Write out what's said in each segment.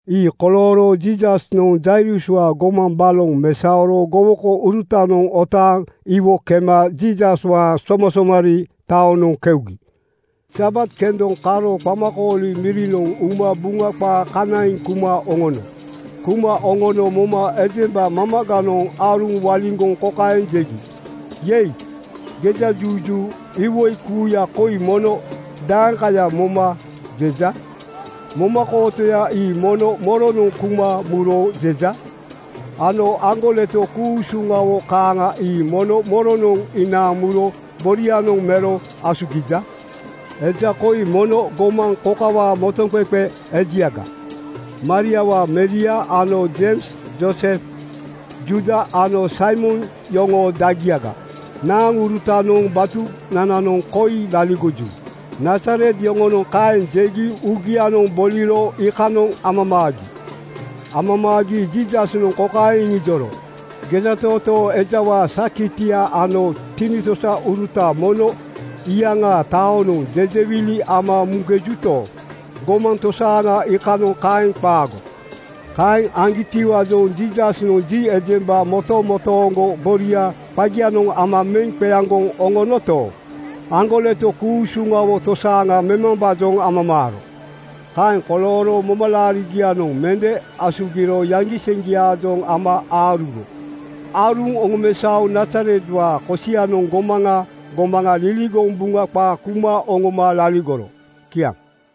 Ii kolooro Jiisasnoŋ Jairuswaa gomaŋ baloŋ mesaoro gowokourutanoŋ otaaŋ iwo kema Jiisaswaa somasomarii taoŋanoŋ keugi. Sabat kendonoŋ karo qamakooli mirinoŋ uma Buŋa qaa kanaiŋ kuma oŋono. Kuma oŋono moma ejemba mamaganoŋ aaruŋ waliŋgoŋ kokaeŋ jegi, “Yei, gejajuju! Iwoi kuuya koi mono daeŋkaya moma jeja? Momakootoya ii mono moronoŋ kuma muro jeja? Ano aŋgoleto ku-usuŋawo kaaŋa ii mono moronoŋ inaaŋ muro borianoŋ mero asugija? Eja koi mono gomaŋ kokawaa motoŋqeqe ejiaga. Mariawaa meria ano Jeims, Joosef, Juuda ano Saimon yoŋoo dagiaga. Naaŋurutanoŋ batunananoŋ koi laligoju.” Nazaret yoŋonoŋ kaeŋ jegi uugianoŋ boliro iikanoŋ amamaagi. Amamaagi Jiisasnoŋ kokaeŋ iŋijoro, “Gejatootoo ejawaa sakiti ano tinitosaurutanoŋ mono iyaŋaa taonoŋ jejewili ama muŋkejuto, gomaŋ tosaaŋa iikanoŋ kaeŋ qaago.” Kaeŋ aŋgitiwaajoŋ Jiisasnoŋ ji ejemba motomotooŋgo boria qagianoŋ ama meŋ qeaŋgoŋ oŋonoto, aŋgoleto ku-usuŋawo tosaaŋa memambaajoŋ amamaaro. Kaeŋ kolooro momalaariŋgianoŋ mende asugiro yaŋgiseŋgiaajoŋ ama aaruro. Aaruŋ oŋomesaoŋ Nazaretwaa kosianoŋ gomaŋa gomaŋa liligoŋ Buŋa qaa kuma oŋoma laligoro. Kiaŋ.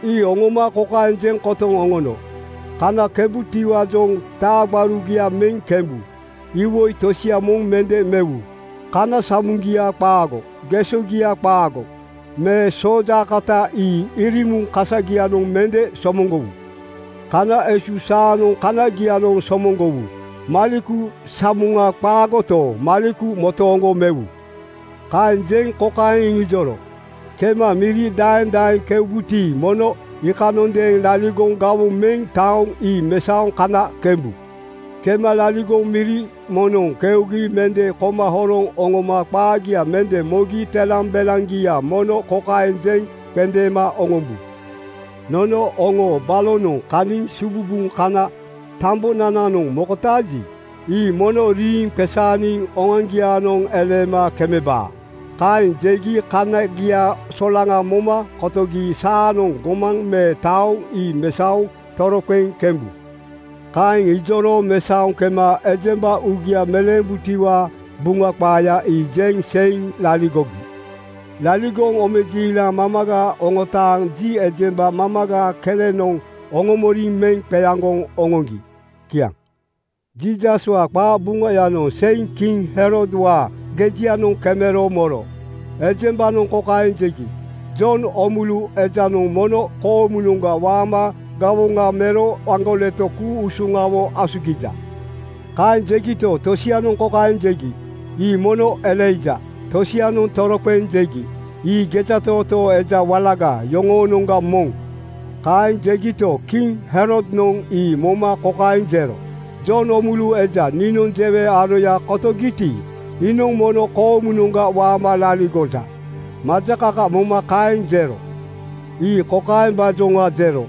Ii oŋoma kokaeŋ jeŋ kotoŋ oŋono, “Kana kembutiwaajoŋ taa gbarugia meŋ kembu. Iwoi tosia moŋ mende mewu. Kana samoŋgia qaago, gesogia qaago me soojaakota ii irimuŋ kasagianoŋ mende somoŋgowu. Kana esu saanoŋ kanagianoŋ somoŋgowu. Maleku samoŋa qaagoto, maleku motooŋgo mewu.” Kaeŋ jeŋ kokaeŋ iŋijoro, “Kema miri daeŋ daeŋ keubuti, mono iikanondeeŋ laligoŋ gawoŋ meŋ taoŋ ii mesaoŋ kana kembu. Kema laligoŋ miri moŋnoŋ keugi mende koma horoŋ oŋoma qaagia mende mogi telambelaŋgia mono kokaeŋ jeŋ qendeema oŋombu, ‘Nono oŋoo balonoŋ kaniŋ sububuŋ kana tambonananoŋ mokotaaji, ii mono riiŋ qesaaniŋ oŋoaŋgiaanoŋ eleema kemebaa.’ Kaeŋ jegi kaniagia solaŋa moma kotogi saanoŋ gomaŋ me taoŋ ii mesaoŋ toroqeŋ kembu.” Kaeŋ iŋijoro mesaoŋ kema ejemba uugia meleembutiwaa Buŋa qaaya ii jeŋ seiŋ laligogi. Laligoŋ omejiilaŋ mamaga oŋotaaŋ ji ejemba mamaga kelenoŋ oŋomoriŋ meŋ qeaŋgoŋ oŋoŋgi. Kiaŋ. Jiisaswaa qabuŋayanoŋ seiŋ kiŋ Herodwaa gejianoŋ kemero moro. Ejembanoŋ kokaeŋ jegi, “Jon Oomulu ejanoŋ mono koomunoŋga waama gawoŋa mero aŋgoleto ku-usuŋawo asugiŋkeja.” Kaeŋ jegito, tosianoŋ kokaeŋ jegi, “Ii mono Elaija.” Tosianoŋ toroqeŋ jegi, “Ii gejatootoo eja walaga yoŋoonoŋga moŋ.” Kaeŋ jegito, kiŋ Herodnoŋ ii moma kokaeŋ jero, “Jon Oomulu eja niinoŋ jewe aroya kotogiti, iinoŋ mono koomunoŋga waama laligoja.” Majakaka moma kaeŋ jero. Ii kokaembaajoŋa jero: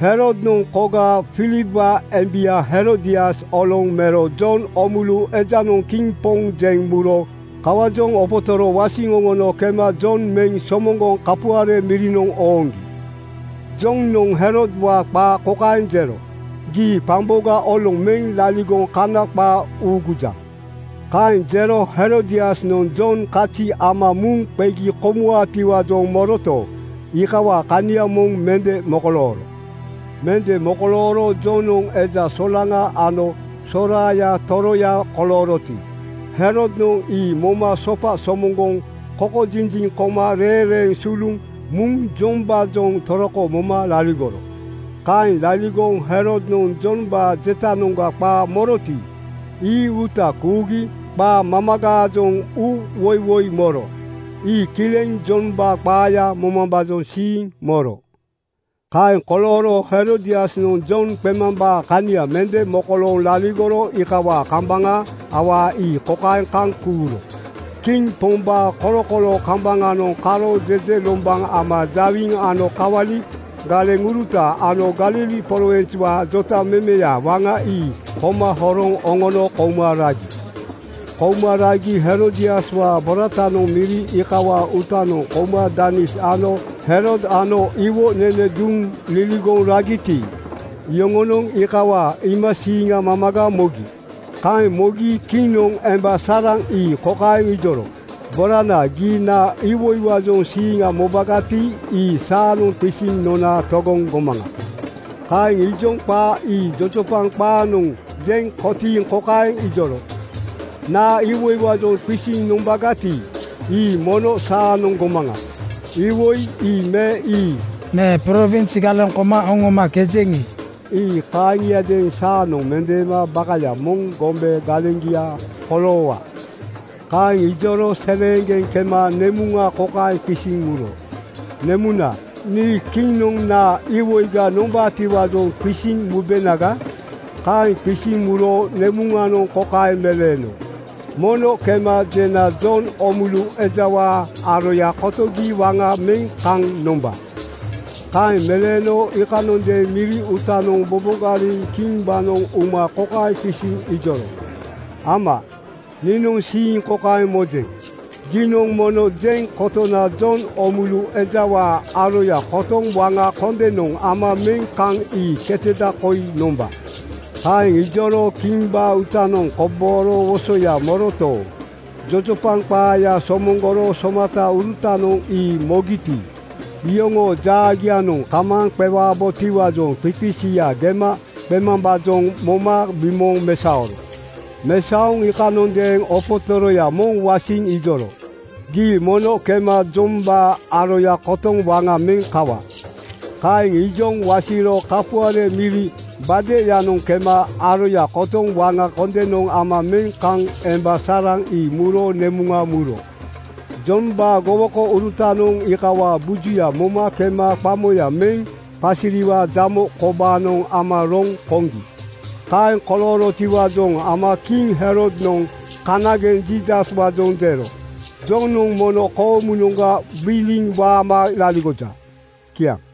Herodnoŋ koga Filipwaa embia Herodias oloŋ mero Jon Oomulu ejanoŋ kiŋ poŋ jeŋ muro kawaajoŋ opotoro wasiŋ oŋono kema Jon meŋ somoŋgoŋ kapuare mirinoŋ ooŋgi. Jonoŋ Herodwaa qaa kokaeŋ jero: “Gii qamboga oloŋ meŋ laligoŋ Kana qaa uugujaŋ.” Kaeŋ jero Herodiasnoŋ Jon kazi ama muŋ qegi komuwaatiwaajoŋ moroto, iikawaa kania moŋ mende mokolooro. Mende mokolooro Jonoŋ eja solaŋa ano soraaya toroya kolooroti, Herodnoŋ ii moma sopa somoŋgoŋ kokojinjiŋ koma reeŋreeŋ suluŋ muŋ Jombaajoŋ toroko moma laligoro. Kaeŋ laligoŋ Herodnoŋ Jombaa jetanoŋga qaa moroti, ii uuta kuugi qaa mamagaajoŋ uuwoiwoi moro. Ii kileŋ Jombaa qaaya momambaa siiŋ moro. Kaeŋ kolooro Herodiasnoŋ Jon qemambaa kania mende mokolooŋ laligoro iikawaa kambaŋa awaa ii kokaeŋ kaŋ kuuro: Kiŋ pombaa kolokoloo kambaŋanoŋ karo jejelombaŋ ama jawiŋ ano kawali galeŋuruta ano Galili prowinswaa jotamemeya waŋa ii koma horoŋ oŋono kouma ragi. Kouma ragi Herodiaswaa boratanoŋ miri iikawaa uutanoŋ kouma danis ano Herod ano iwo nene duŋ liligoŋ ragiti, iyoŋonoŋ iikawaa iimasiiŋa mamaga mogi. Kaeŋ mogi kiŋnoŋ emba saraŋ ii kokaeŋ ijoro, “Borana, gii naa iwoiwaajoŋ siiŋa mobagati, ii saanoŋ qisiŋ nona togoŋ gomaŋa.” Kaeŋ ijoŋ qaa ii jojopaŋ qaanoŋ jeŋ kotiiŋ kokaeŋ ijoro, “Naa iwoiwaajoŋ qisiŋ nombagati, ii mono saanoŋ gomaŋa. Iwoi ii me ii me prowins galeŋ koma oŋomakejeŋi, ii kaaŋiadeeŋ saanoŋ mendeema bakaya moŋ gombe galeŋgia koloowa.” Kaeŋ ijoro seleeŋgeŋ kema nemuŋa kokaeŋ qisiŋ muro, “Nemuna, nii Kiŋnoŋ naa iwoiga nombaatiwaajoŋ qisiŋ mubenaga?” Kaeŋ qisiŋ muro nemuŋanoŋ kokaeŋ meleeno, “Mono kema jena Jon Oomulu ejawaa aroya kotogi waŋa meŋ kaŋ nomba.” Kaeŋ meleeno iikanondeeŋ miri uutanoŋ bobogariŋ kimbaanoŋ uma kokaeŋ qisiŋ ijoro, “Ama, niinoŋ siiŋ kokaeŋ mojeŋ: Giinoŋ mono jeŋ kotona Jon Oomulu ejawaa aroya kotoŋ waŋa kondenoŋ ama meŋ kaŋ ii keteda koi nomba.” Kaeŋ ijoro kimbaa uutanoŋ kobooro wosoya moroto, jojopaŋ qaaya somoŋgoro somataurutanoŋ ii mogiti, iyoŋoo jaagianoŋ kamaaŋ qewabotiwaajoŋ qiqisiya gema qemambaajoŋ moma bimooŋ mesaoro. Mesaoŋ iikanondeeŋ opotoroya moŋ wasiŋ ijoro, “Gii mono kema Jombaa aroya kotoŋ waŋa meŋ kawa.” Kaeŋ ijoŋ wasiro kapuare miri gbadeyanoŋ kema aroya kotoŋ waŋa kondenoŋ ama meŋ kaŋ emba saraŋ ii muro nemuŋa muro. Jombaa gowokourutanoŋ iikawaa bujuya moma kema qamoya meŋ qasiriwaa jamo kobaanoŋ ama roŋ koŋgi. Kaeŋ koloorotiwaajoŋ ama kiŋ Herodnoŋ kanageŋ Jiisaswaajoŋ jero, “Jonoŋ mono koomunoŋga gbiliŋ waama laligoja.” Kiaŋ.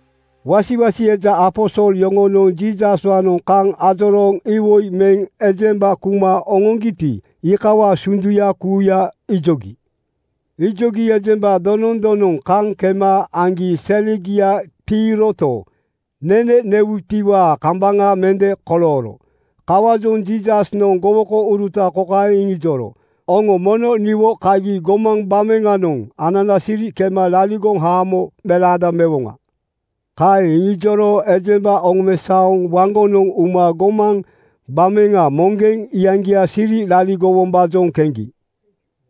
Wasiwasi eja aposol yoŋonoŋ Jiisaswaanoŋ kaŋ ajorooŋ iwoi meŋ ejemba kuma oŋoŋgiti, iikawaa sunduya kuuya ijogi. Ijogi ejemba donoŋ donoŋ kaŋ kema aŋgi selegia tiiroto, nene newuyatiwaa kambaŋa mende kolooro. Kawaajoŋ Jiisasnoŋ gowokouruta kokaeŋ iŋijoro, “Oŋo mono niwo kagi gomaŋ gbameŋanoŋ anana siri kema laligoŋ haamo melaada mewoŋa.” Kaeŋ iŋijoro ejemba oŋomesaoŋ waŋgonoŋ uma gomaŋ gbameŋa moŋgeŋ iyaŋgia siri laligowombaajoŋ keŋgi.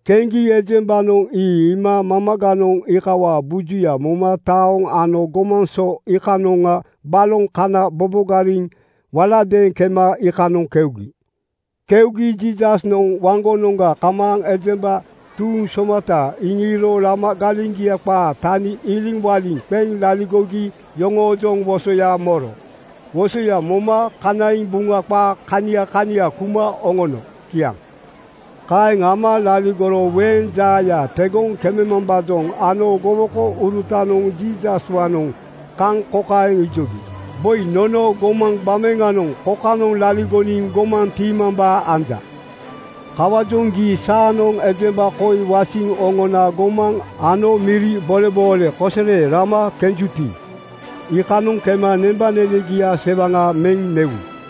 Keŋgi ejembanoŋ ii iima mamaganoŋ iikawaa bujuya moma taoŋ ano gomaŋ so iikanoŋa baloŋ kana bobogariŋ waladeeŋ kema iikanoŋ keugi. Keugi Jiisasnoŋ waŋgonoŋga kamaaŋ ejemba tuuŋ somata iŋiiro lama galeŋgia qaa tani iliŋwaliŋ qeŋ laligogi yoŋoojoŋ wosoya moro. Wosoya moma kanaiŋ Buŋa qaa kania kania kuma oŋono. Kiaŋ. Kaeŋ ama laligoro weeŋ jaaya tegoŋ kememambaajoŋ ano gowokourutanoŋ Jiisaswaanoŋ kaŋ kokaeŋ ijogi, “Boi. Nono gomaŋ gbameŋa kokanoŋ laligoniŋ gomaŋ tiimambaa anja. Kawaajoŋ gii saanoŋ ejemba koi wasiŋ oŋona gomaŋ ano miri boleboole kosere rama kenjuti, iikanoŋ kema nembanenegia sewaŋa meŋ newu.”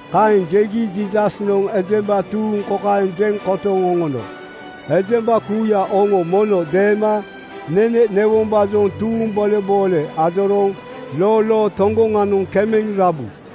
Kaeŋ jegi Jiisasnoŋ ejemba tuuŋ kokaeŋ jeŋ kotoŋ oŋono, “Ejemba kuuya, oŋo mono deema nene newombaajoŋ tuuŋ boleboole ajorooŋ lolo toŋgoŋanoŋ kemeŋ rabu.”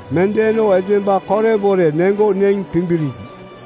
Mendeeno ejemba korebore neŋgo neŋ timbiriigi.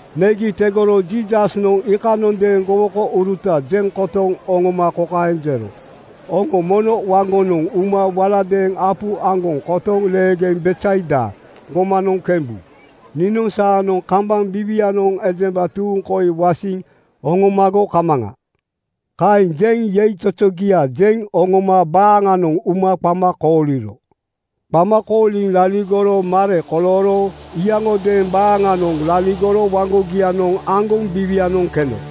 Negi tegoro Jiisasnoŋ iikanondeeŋ gowokouruta jeŋ kotoŋ oŋoma kokaeŋ jero, “Oŋo mono waŋgonoŋ uma waladeeŋ apu aŋgoŋ kotoŋ leegeŋ Betsaida gomanoŋ kembu. Niinoŋ saanoŋ kambaŋ biiwianoŋ ejemba tuuŋ koi wasiŋ oŋomago kamaŋa.” Kaeŋ jeŋ yeizozogia jeŋ oŋooma baaŋanoŋ uma qama kooliro. Qama kooliŋ laligoro mare kolooro iyaŋodeeŋ baaŋanoŋ laligoro waŋgogianoŋ aŋgoŋ biiwianoŋ keno.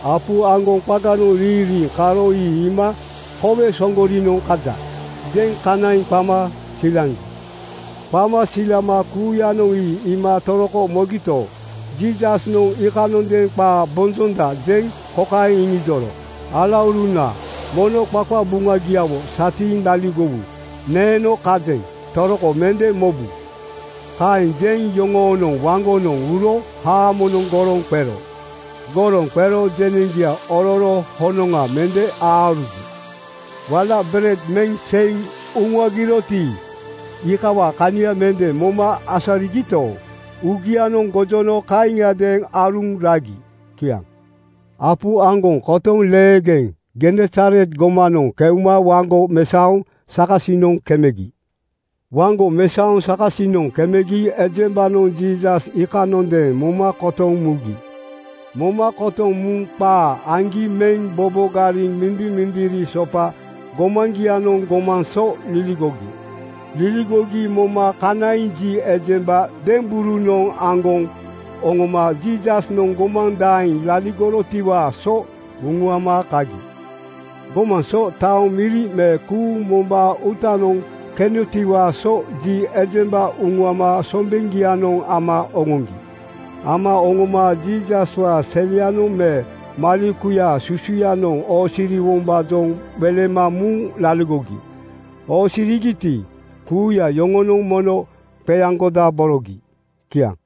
Apu aŋgoŋ qaganoŋ riiŋ riiŋ karo ii iima “Kowe Soŋgorinoŋ kaja!” jeŋ kanaiŋ qama silaŋgi. Qama silama kuuyanoŋ ii iima toroko mogito, Jiisasnoŋ iikanondeeŋ qaa bonjonda jeŋ kokaeŋ iŋijoro, “Alauruna, mono qaqabuŋabuŋagiawo satiiŋ laligowu. Neeno kajeŋ. Toroko mende mobu.” Kaeŋ jeŋ yoŋoonoŋ waŋgonoŋ uro haamonoŋ goroŋ qero. Goroŋ qero jeneŋgia ororo honoŋa mende aarugi. Wala bered meŋ seiŋ uŋuagiroti, iikawaa kania mende moma asarigito, uugianoŋ gojono kaaŋiadeeŋ aaruŋ ragi. Kiaŋ. Apu aŋgoŋ kotoŋ leegeŋ Genesaret gomanoŋ keuma waŋgo mesaoŋ sakasinoŋ kemegi. Waŋgo mesaoŋ sakasinoŋ kemegi ejembanoŋ Jiisas iikanondeeŋ moma kotoŋ mugi. Moma kotoŋ muŋ qaa aŋgi meŋ bobogariŋ mindimindiri sopa gomaŋgianoŋ gomaŋ so liligogi. Liligogi moma kanaiŋ ji ejemba demberunoŋ aŋgoŋ oŋoma Jiisasnoŋ gomaŋ daeŋ laligorotiwaa so uŋuama kagi. Gomaŋ so, taoŋ, miri me kuuŋ mombaa uutanoŋ kenotiwaa so ji ejemba uŋuama sombeŋgianoŋ ama oŋoŋgi. Ama oŋoma Jiisaswaa selianoŋ me malekuyaa susuyanoŋ oosiriwombaajoŋ welema muŋ laligogi. Oosirigiti, kuuya yoŋonoŋ mono qeaŋgodaborogi. Kiaŋ.